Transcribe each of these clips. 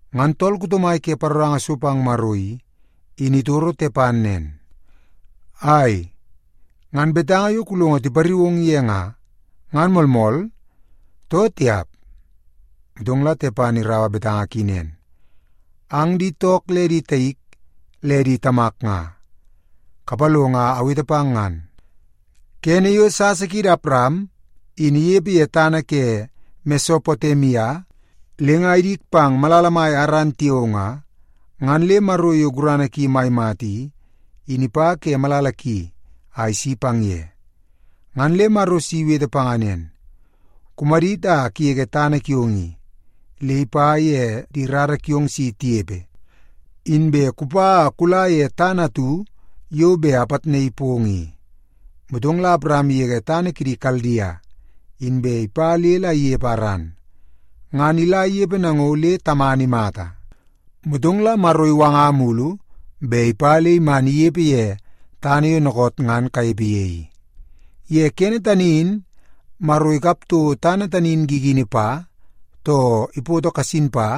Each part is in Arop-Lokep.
Ngan tool kuto mai ke paroranga so pang Maro i, in itoro Tepan nen, “Ai, ngan betanga yo kulongo tipariu ong ye nga, ngan moolmool, too tiap?” Motong la Tepan iraua betanga ki nen, “Ang di took le di taik le di tamak nga, kapalongo a awete pang ngan. Kene yo sasa kiidi Awaram in inepe ye tana ke Mesopotemia le nga idik pang malala mai Aran tiao nga, ngan le Maro yo gurana ki mai mata i, in ipa ke malala ki a isi pang ye. Ngan le Maro si iwete panga nen, ‘Kumadit a kugege tana kiong i le ipa ye di rara kiong si tinepe, inbe kupa a kula ye tana atu yo bet la apitnaii pong i.’ “Motong la Awaram igege tana kidi Kaldia, inbe ipa le la inepe Aran. Ngan ila inepe nango le tamana imata, motong la Maro iwanga mulu bet ipa le iman inepe ye tana yo dookoot ngan kanepe ye i. Ye kene tani in Maro ikap toko tana tani i gigini pa, too ipoto kasin pa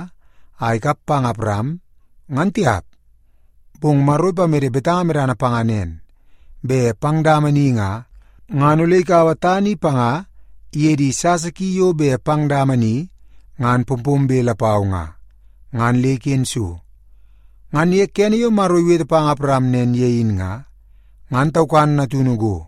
a ikap pang Awaram, ngan tiap. Bong Maro ipamede betanga medana panga nen, bet pang dama ni nga, ngan ole ikaua tana i panga iye di sasa ki yo bet pang dama ni ngan pompombe lapau nga, ngan le iken so. Ngan ye kene yo Maro iwete pang Awaram nen ye in nga, ngan taukan natunu go.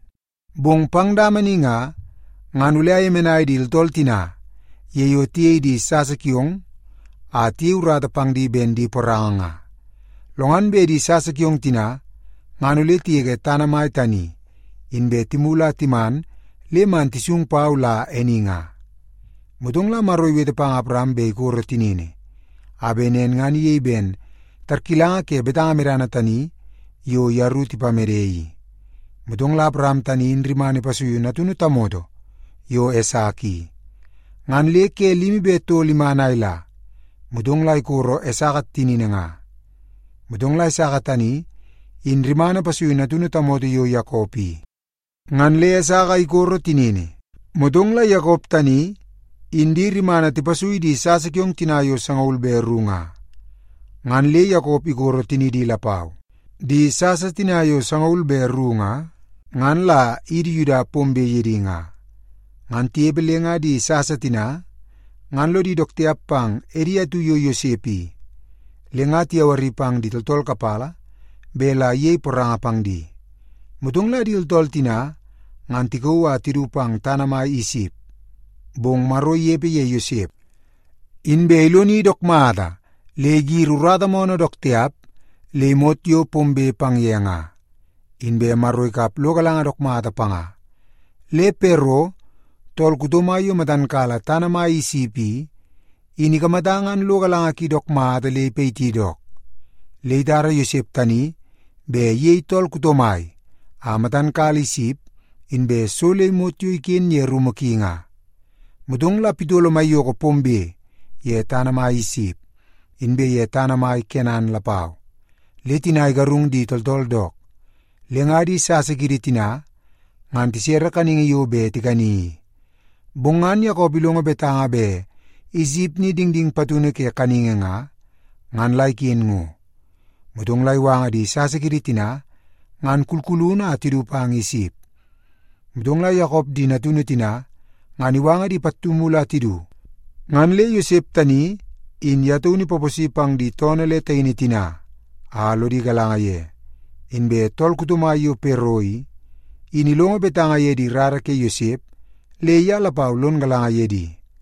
Bong pang dama ni nga, ngan ole ayemenai di tooltool tina ye yo tiyei di sasa kiong a tiyei urata pang di ben di poranga nga. Lo ngan bet di sasa kiong tina ngan ole tigege tana mai tani, inbe timulu a timan le man tisung pau la e ni nga.’ Motong la Maro iwete pang Awaram bet ikoro tinini, a bet nen ngan iyei ben tarkilanga ke betanga medana tani yo yeru tipamede i. Motong la Awaram tani in rimana ipasuiu natunu tamoto yo Esaka i, ngan le ke limi be tol iman a ila, motong la ikoro Esaka tinini nga. Motong la Esaka tani in rimana ipasuiu natunu tamoto yo Yakop i, ngan le Esaka ikoro tinini. Motong la Yakop tani in di rimana tipasui di sasa kiong tina yo sangaul be ru nga, ngan le Yakop ikoro tinidi lapau. Di sasa tina yo sangaul be ru nga, ngan la idi Yuda pombe ye di nga. “Ngan tinepe le nga di sasa tina ngan lodi dook tiap pang edi atu yo Yosep i, le tiyawari pang di tooltool kapala bet la iyei poranga pang di. Motong la di tooltool tina ngan tikauu a tidu pang tana mai Isip, bong Maro inepe ye Yosep, inbe iloni dook mata le igiri urata moonoo dook tiap le imot yo pombe pang ye nga. Inbe Maro ikap lo galanga dook mata panga, le Pero, tool kuto mai yo matan kala tana mai Isip i, in ikamata ngan lo galanga ki dook mata le ipayiti dook. Le itara Yosep tani bet iyei tool kuto mai a matan kala Isip inbe so le imot yo iken ye rumu ki nga. “Motong la pitolo maiyoko pombe ye tana mai Isip, inbe ye tana mai Kenan lapau, le tina igarung di tooltool dook. Le nga di sasa kiidi tina ngan tisere kaningi yo bet tikani i. Bong ngan Yakop ilongo betanga bet Isip ni dingding patunu ke kaningi nga, ngan la iken ngo. Motong la iwanga di sasa kiidi tina ngan kulkulunu a tidu pang Isip. Motong la Yakop di natunu tina ngan iwanga di pattu mulu a tidu, ngan le Yosep tani in ye taunu ipaposi pang di toonoo le taini tina a lodi galanga ye. Inbe tool kuto mai yo Pero i, in ilongo betanga ye di rara ke Yosep, le ye lapau lon galanga ye di.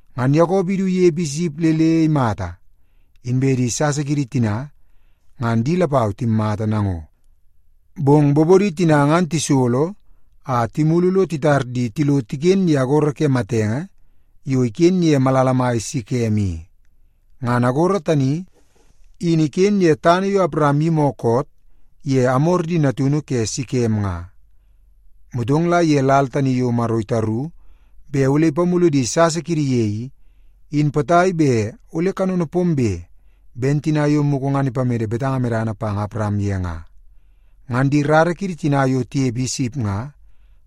Ngan Yakop idu inepe Isip le le imata, inbe di sasa kiidi tina, ngan di lapau timmata nango. Bong bobodi tina ngan tisolo a timulu lo titar di tilo tiken ye agoro ke matenge yo iken ye malala mai Sekem i. Ngan agoro tani, in iken ye tana yo Awaram iyimi koot ye Amor di natunu ke Sekem nga. “Motong la ye lal tani yo Maro itaru bet ole ipamulu di sasa kiidi ye i, in potai bet ole kanono pombe ben tina yo mugu ngan ipamede betanga medana pang Awaram ye nga, ngan di rara kiidi tina yo tinepe Isip nga,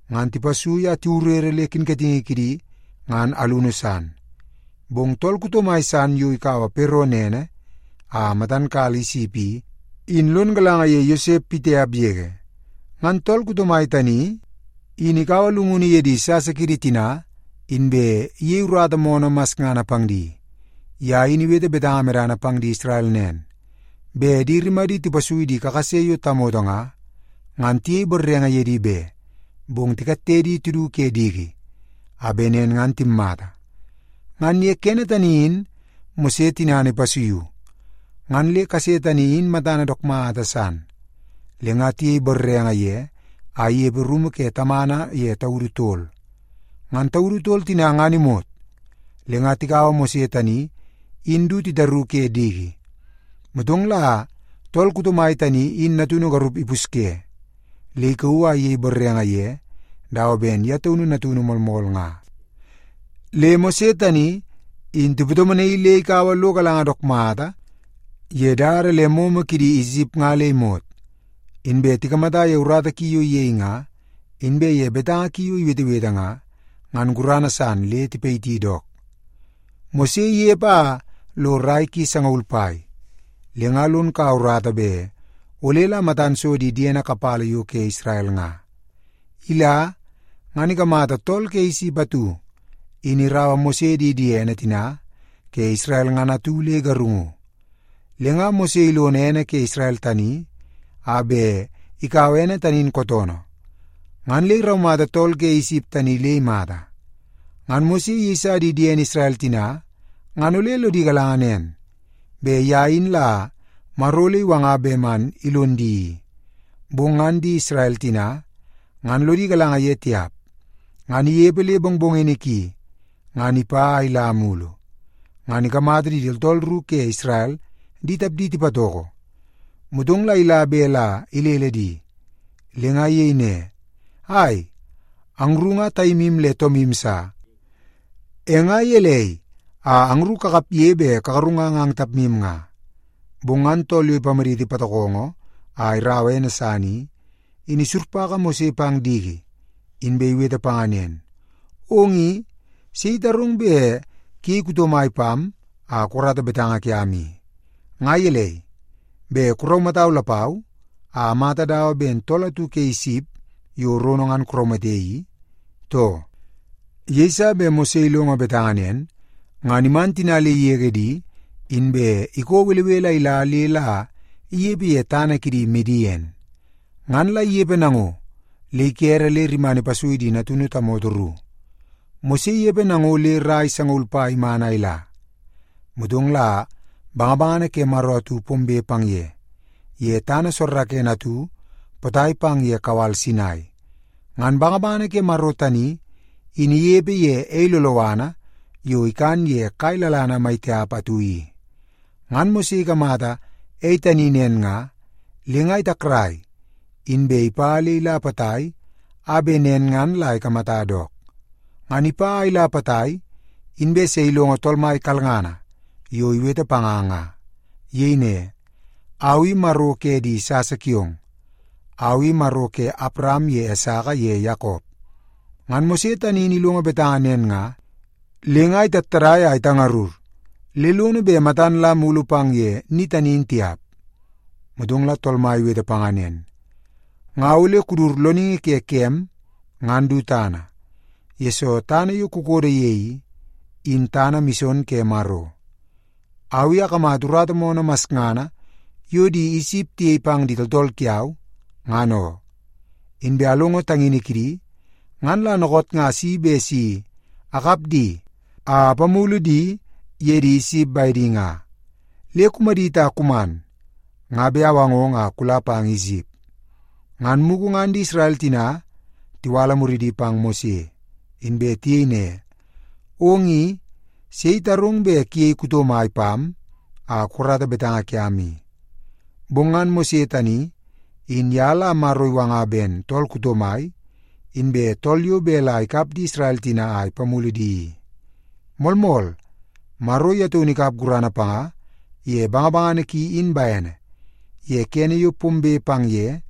ngan tipasui a tiwurere le kinkatingi kidi ngan alunu san. Bong tool kuto mai san yo ikaua Pero nene a matan kala Isip i, in lon galanga ye Yosep pitiap yege. Ngan tool kuto mai tani in ikaua llungunu ye di sasa kiidi tina, inbe iyei urata moonoo masngana pang di. Ye in iwete betanga medana pang di Isrel nen, bet di rimadi tipasui di kakase yo tamoto nga, ngan tiyei borrenge ye di be, bong tikatte di tidu ke diki a bet nen ngan timmata. “Ngan ye kene tani in Mose tinana ipasuiu, ngan le kase tani in matana dook mata san, le nga tiyei borrenge ye a inepe rumu ke tamana ye taudu tol. Ngan taudu tol tina ngan imot, le nga tikaua Mose tani in du titaru ke diki. Motong la tool kuto mai tani in natunu garup ipusye, le ikauu a iyei borrenge ye dawa ben ye taunu natunu moolmool nga. Le Mose tani in tipatomonaii le ikaua lo galanga dook mata ye dada le momo kidi Isip nga le imot. Inbe tikamata ye urata ki yo iyei nga, inbe ye betanga ki yo iwetewete nga, ngan gurana san le tipayiti dook. “Mose inepe a lo rai ki sangaul pai, le nga lon kaua urata bet ole la matan so di diene kapala yo ke Isrel nga. Ila, ngan ikamata tool ke Isip atu in iraua Mose di diene tina ke Isrel ngan atu le igarungu. Le nga Mose ilono ene ke Isrel tani, a bet ikaua ene tani in kootoonoo, ngan le iraumata tool ke Isip tani le imata. Ngan Mose iyeisa di diene Isrel tina ngan ole lodi galanga nen, bet ye in la Maro ole iwanga bet man ilon di i, bong ngan di Isrel tina ngan lodi galanga ye tiap. Ngan inepe le mongmongini ki, ngan ipa a ila mulu, ngan ikamata di tooltool ru ke Isrel di tapdi tipatoko. Motong la ila bet la ilele di, le nga iyei ne, ‘Ai, angru nga taimu le toomu sa, e nga gelei a angru kakapge bet kagarungang ang tapmu nga?’ “Bong ngan tool yo ipamaditi patokongo a iraua ene san i, in isurpaka Mose pang diki, inbe iwete panga nen, ‘Ong i, sei itarong bet kuyei kuto mai pam a kukarata betanga kiam i? Nga gelei, bet kuraumatau lapau a amata dawa ben tool atu ke Isip yo rono ngan kuraumate i, too?’ Yeiso bet Mose ilongo betanga nen, ngan iman tina le igege di, inbe ikoo belebele a ila le la inepe ye tana kidi Midien. Ngan la inepe nango le ikere le rimana ipasui di natunu tamoto ru. “Mose inepe nango le rai sangaul pai iman a ila. Motong la bangabangana ke Maro atu pombe pang ye, ye tana soorookoonoo atu potai pang ye kawal Sinai. Ngan bangabangana ke Maro tani in inepe ye ei loloana yo ikan ye kai lalana mai tiap atu i. Ngan Mose ikamata ei tani nen nga, le nga itakrai, inbe ipa le ila potai a bet nen ngan la ikamata dook. Ngan ipa a ila potai, inbe se ilongo Tool Mai kalngana yo iwete panga nga. Iyei ne, ‘Au i Maro ke di sasa kiong. Au i Maro ke Awaram ye Esaka ye Yakop.’ Ngan Mose tani in ilongo betanga nen nga, le nga itattadai a itangarur le lono bet matan la mulu pang ye ni tani in tiap. “Motong la Tool Mai iwete panga nen, ‘Nga ole kudut loningi ke kem ngan du tana, yesoo tana yo kukodo ye i, in tana mison ke Maro. Au i akamata urata moonoo masngana yo di Isip tiyei pang di tooltool kiau, ngan oo. Inbe alongo tangini kidi, ngan la dookoot nga asi bet si akap di a apamulu di ye di Isip bedi nga. Le kumadit a kuman, nga bet awangong a kula pang Isip.’ “Ngan mugu ngan di Isrel tina tiwala muridi pang Mose, inbe tiyei ne, ‘Ong i, sei itarong bet kuyei kuto mai pam a kukarata betanga kiam i?’ Bong ngan Mose tani, in ye la Maro iwanga ben tool kuto mai, inbe tool yo bet la ikap di Isrel tina a ipamulu di i. Moolmool, Maro ye taunu ikap gurana panga ye bangabangana ki in bene, ye kene yo pombe pang ye,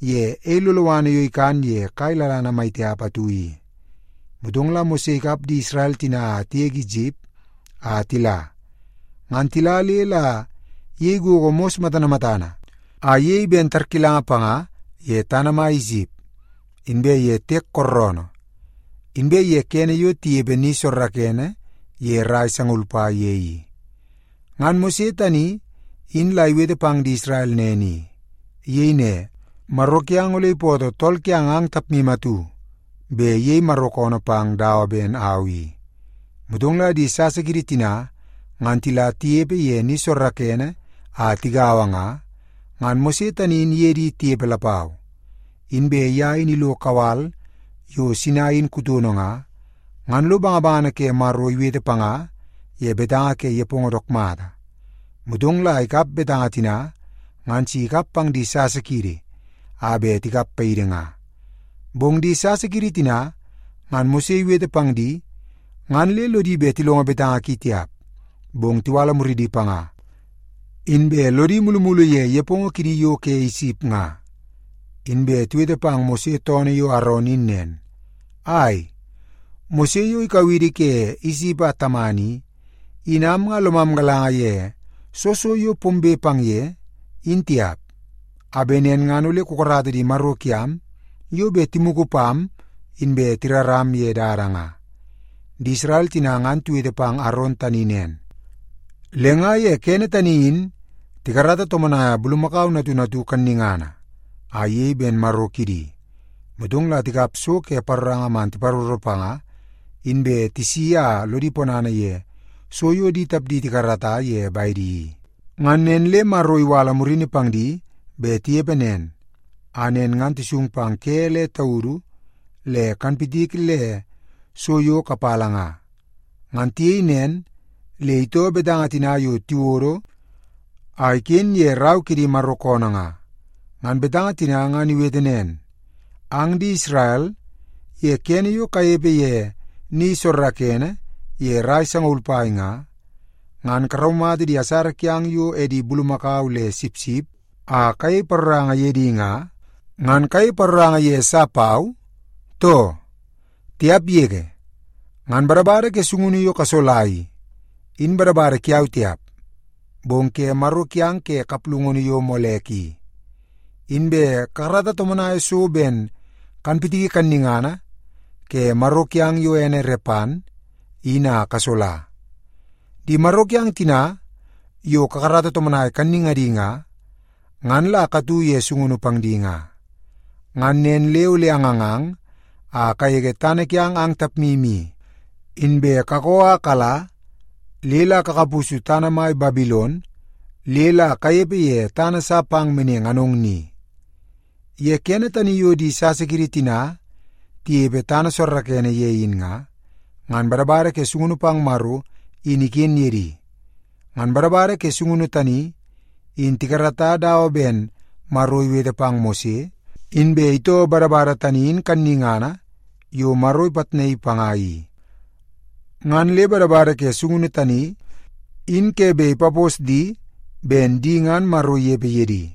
ye ei loloana yo ikan ye kai lalana mai tiap atu i. Motong la Mose ikap di Isrel tina a tigege Isip a tila. Ngan tila le la iyei gogo mos matana matana a iyei ben tarkilanga panga ye tana mai Isip, inbe ye Tiek Kooroonoo, inbe ye kene yo tinepe ni soorookoonoo ye rai sangaul pai ye i. “Ngan Mose tani in la iwete pang di Isrel nen i. Iyei ne, ‘Maro kiang ole ipootoo tool kiang ang tapmu atu bet iyei Maro koonoo pang dawa ben au i.’ Motong la di sasa kiidi tina ngan tila tinepe ye ni soorookoonoo a tigaua nga, ngan Mose tani in iye di tinepe lapau. Inbe ye in ilo kawal yo Sinai in kutono nga, ngan lo bangabangana ke Maro iwete panga ye betanga ke nepongo dook mata. Motong la ikap betanga tina ngan si ikap pang di sasa kiidi a bet tikap paidi nga. “Bong di sasa kiidi tina ngan Mose iwete pang di, ngan le lodi bet tilongo betanga ki tiap, bong tiwala muridi panga, inbe lodi mulumulu ye nepongo kidi yo ke Isip nga. Inbe tiwete pang Mose toonoo yo Aron in nen, ‘Ai, Mose yo ikau idi ke Isip a taman i, in am nga lomam galanga ye soo so yo pombe pang ye, in tiap. A bet nen ngan ole kukarata di maro kiam yo bet timugu pam inbe tiraram ye dada nga.’ Di Isrel tina ngan tiwete pang Aron tani nen, le nga ye kene tani in tikarata tomonaia bulumakau natunu atu kannungana a iyei ben maro kidi, motong la tikap so ke paroranga man tiparoro panga, inbe tisiki a lodi ponana ye so yo di tapdi tikarata ye bedi i. “Ngan nen le Maro iwala murini pang di bet tinepe nen, a nen ngan tisung pang ke le taudu le kanpitiki le so yo kapala nga. Ngan tiyei nen le itoo betanga tina yo tiwodo a iken ye rau ke di Maro koonoo nga. Ngan betanga tina ngan iwete nen, ‘Ang di Isrel, ye kene yo kanepe ye ni soorookoonoo ye rai sangaul pai nga, ngan karaumata di asara kiang yo edi bulumakau le sipsip a kayei paroranga ye di nga, ngan kayei paroranga ye sa pau, too? Tiap yege! Ngan badabada ke sungunu yo kasola i, in badabada kiau tiap, bong ke maro kiang ke kaplungunu yo Molek i. Inbe kakarata tomonai so ben kanpitiki kannungana ke maro kiang yo ene Repan, in a kasola. Di maro kiang tina yo kakarata tomonai kannungadi nga, ngan la katu ye sungunu pang di nga. Ngan nen le ole angangang a kagege tana kiang ang tapmu i, inbe kakoo a kala le la kakapusu tana mai Babilon le la kanepe ye tana sa pang meneng anong ni.’ “Ye kene tani yo di sasa kiidi tina tinepe tana soorookoonoo ye in nga, ngan badabada ke sungunu pang Maro in iken ye di. Ngan badabada ke sungunu tani, in tikarata dawa ben Maro iwete pang Mose, inbe itoo badabada tani in kannungana yo Maro ipitnaii panga i. Ngan le badabada ke sungunu tani, in ke bet ipapos di ben di ngan Maro inepe ye di.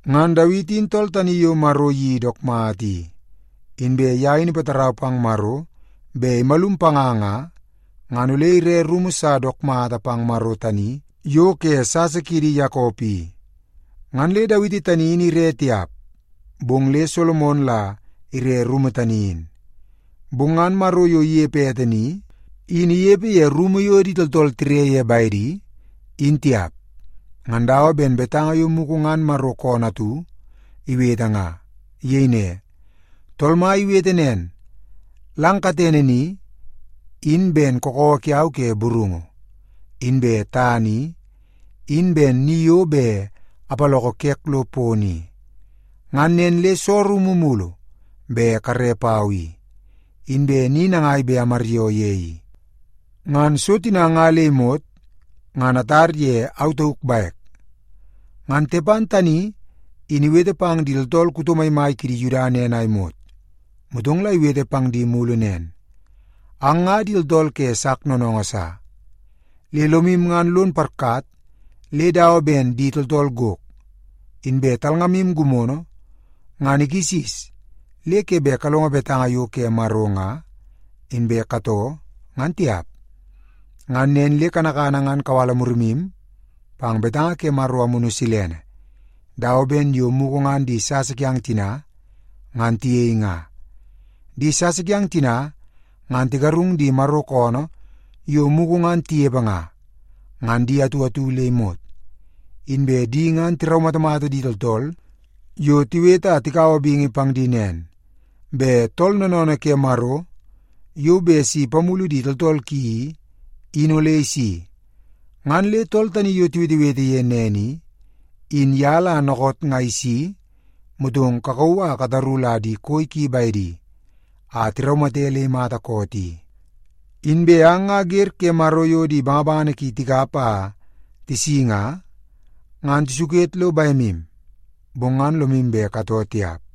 Ngan Dawiti in tool tani yo Maro iyeii dook mata i. Inbe ye in ipatarau pang Maro bet imalum panga nga, ngan ole ire rumu sa dook mata pang Maro tani yo ke sasa kiidi Yakop i. Ngan le Dawiti tani in ire tiap, bong le Solomon la ire rumu tani in. “Bong ngan Maro yo inepe ete ni, in inepe ye rumu yo di tooltool tire ye bedi, in tiap. Ngan dawa ben betanga yo mugu ngan Maro koonoo atu iwete nga. Iyei ne, ‘Tool Mai iwete nen, “Lang katene ni, in ben kakawa kiau ke burungu, inbe tana i, in ben ni yo bet apaloko kek lo pono i. Ngan nen le soo rumu mulu bet kare pau i? Inbe ni nangai bet amaryoo ye i? Ngan so tina nga le imot, ngan atar ye au tauk bek.”’” Ngan Tepan tani in iwete pang di tooltool kuto maimai kidi Yuda nen a imot, motong la iwete pang di mulu nen, “Ang nga di tooltool ke sak noonoongoo sa. Le lomu ngan lon iparkat le dawa ben di tooltool gok, inbe talngamu gimono ngan ikisis le ke bet kalongo betanga yo ke Maro nga, inbe katoo ngan tiap. Ngan nen le kanakana ngan kawala murimu pang betanga ke Maro Amunu Silene, dawa ben yo mugu ngan di sasa kiang tina, ngan tiyei nga. Di sasa kiang tina ngan tigarung di Maro koonoo yo mugu ngan tinepe nga, ngan di atu atu le imot. Inbe di ngan tiraumatamata di tooltool yo tiwete a tikaua bingi pang di nen, bet Tool Noonoonoo ke Maro yo bet si ipamulu di tooltool ki i, in ole isi. Ngan le tool tani yo tiwetewete ye nen i, in ye la dookoot nga isi, motong kakauu a kataru la di koi ki bedi, a tiraumate le imata koot i. Inbe ang nga wer ke Maro yo di bangabangana ki tikap a tisi nga, ngan tisuket lo bemu, bong ngan lomu bet katoo tiap.”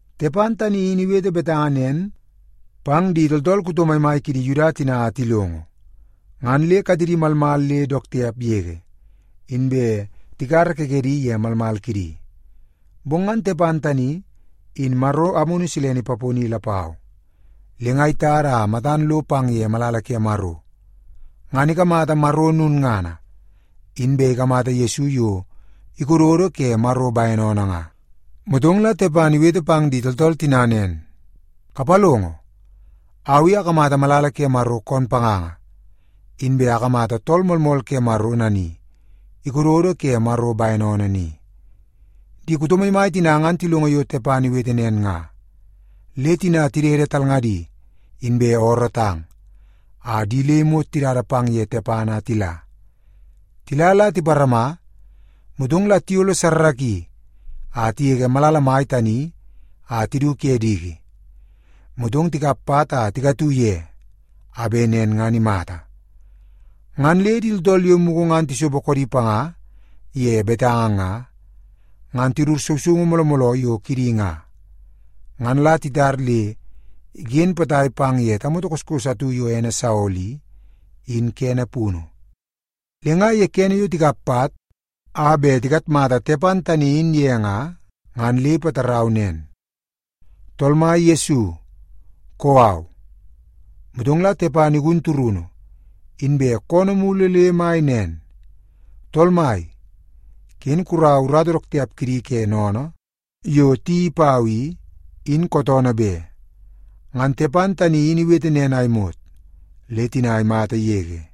Tepan tani in iwete betanga nen pang di tooltool kuto maimai kidi Yuda tina a tilongo, ngan le katedi malmal le dook tiap yege, inbe tikara kekedi ye malmal kidi. Bong ngan Tepan tani, in Maro Amunu Silene ipaponi lapau, le nga itada a matan lo pang ye malala ke Maro, ngan ikamata Maro lulngana, inbe ikamata Yesu yo ikododo ke Maro bene oonoo nga. Motong la Tepan iwete pang di tooltool tina nen, “Kapalongo! Au i akamata malala ke Maro koon panganga, inbe akamata Tool Moolmool Ke Maro nani ikododo ke Maro bene oonoo ni.” Di kuto maimai tina ngan tilongo yo Tepan iwete nen nga, le tina tidede talngadi, inbe oorootang, a di le imot tidada pang ye Tepan a tila. Tila la tiparama, motong la tiyolle a tigege malala mai tani a tidu ke diki, motong tikap pat a tikatu ye a bet nen ngan imata. Ngan le di tooltool yo mugu ngan tisopo koodi panga ye betanga nga, ngan tidut sousoungu mooloo mooloo yo kidi nga, ngan la titar le iken potai pang ye tamoto kase atu yo ene Saolo i, in kene punu. Le nga kene yo tikap pat a bet tikatmata Tepan tani in ye nga, ngan le ipatarau nen, “Tool Mai Yesu, kou au.” Motong la Tepan igun turunu, inbe koonoo mulu le mai nen, “Tool Mai, ken kuraua urata dook tiap kidi ke sennene yo tiyeii pau i, in kootoonoo be.” Ngan Tepan tani in iwete nen a imot, le tina imata yege.